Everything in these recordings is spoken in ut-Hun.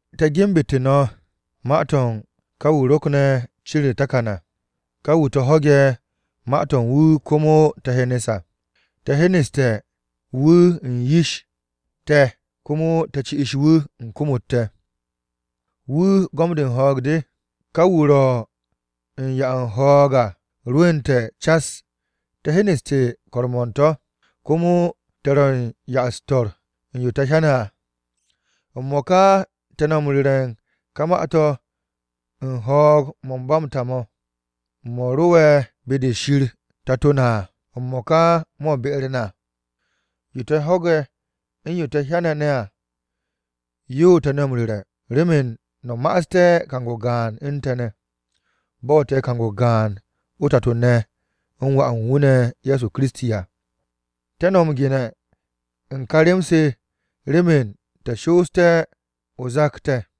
Te̱ genbu̱te̱ no̱ ma-to̱ u̱n ká wu̱ ro̱kne̱ cin u̱r-takan à, ká wu̱ te̱ ho̱ge̱ ma-to̱ u̱n wu̱ komo te̱ hyenes à. Te̱ hyeneste̱ wu̱ u̱n yish te̱ komo te̱ ci'is wu̱ u̱n kom-u̱t te̱. Wu̱ gom-de u̱n ho̱o̱g de. Ká wu̱ ro̱ u̱n 'ya u̱n ho̱o̱g à rwu̱u̱nte̱ cas, te̱ hyeneste̱ ko̱r-mo̱ u̱n to̱, komo te̱ ro̱ ya-u̱s-to̱r u̱n yo te̱ hyane̱ à. M-mo̱ka te̱ no̱ m-ru̱re̱ ka ma-to̱ u̱n ho̱o̱g-mo̱ u̱n ba m-ta mo̱, mo̱ ro'e̱ be-de Shir Tato na à, m-mo̱ka mo̱ be-u̱r na. Yo te̱ ho̱ge̱, u̱n yo te̱ hyane̱ ne̱ à, yo te̱ no̱ m-ru̱re̱, remen no̱ ma'aste̱ kang-o gaan u̱n te̱ ne̱. Bo̱ te̱ kang-o gaan o-Tato ne̱ u̱n Wà u̱n wu̱ ne̱ Ye̱so Kiristi à. Te̱ no̱ m-gene̱ u̱n kà rem-se remen te̱ shooste̱ zak-o te̱.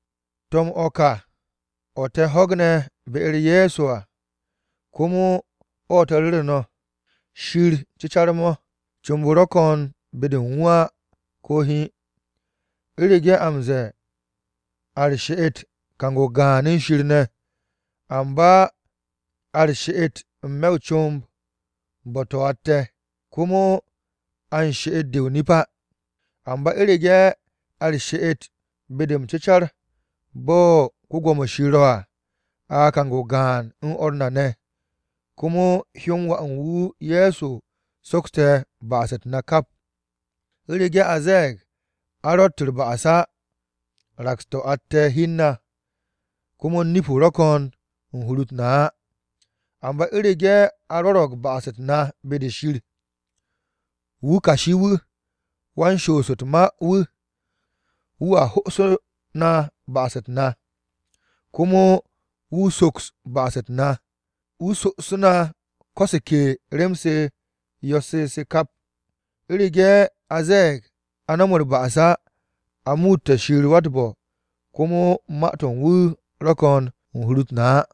To̱m-o̱ ká o̱ te̱ o̱ ho̱gne̱ be-u̱r Ye̱so à komo o̱ te̱ ru̱ru̱ no̱, Shir cecar-mo̱, comb-o ro̱ ko̱n be-de u̱n wu̱ á ko̱ hiin. U̱rege̱ a m-ze̱e̱ a u̱r-she'et kang-o gaan u̱n Shir ne̱, amba a u̱r-she'et n-me̱ o-comb, bo̱-to̱ atte̱, komo a u̱n she'et-de o-nip á. Amba u̱rege̱ a u̱r-she'et be-de m-cecar bo̱ Shir ro̱ à, a kang-o gaan u̱n o̱r na ne̱. Komo hyó-m Wà u̱n wu̱ Ye̱so sokste̱ ba'as-u̱t na kap. U̱rege̱ a ze̱e̱g a ro̱tt u̱r-ba'as á, raks-to̱ atte̱ hi u̱n na, komo nip-o ro̱ ko̱n u̱n hur-u̱t na á. Amba u̱rege̱ a rwo̱ro̱g ba'as-u̱t na be-de Shir, wu̱ kashi-wu̱, wan-shoos u̱t-ma wu̱, wu̱a ho'osu̱ ba'as-u̱t na, komo wu̱ soks ba'as-u̱t na, wu̱ so'osu̱ na ko̱ se ke rem-u̱s yo̱-se se kap. U̱rege̱ a ze̱e̱g a no̱m u̱r-ba'as á, a muute̱ Shir wa-u̱t-bo̱, komo ma-to̱ u̱n wu̱ ro̱ ko̱n u̱n hur-u̱t na á.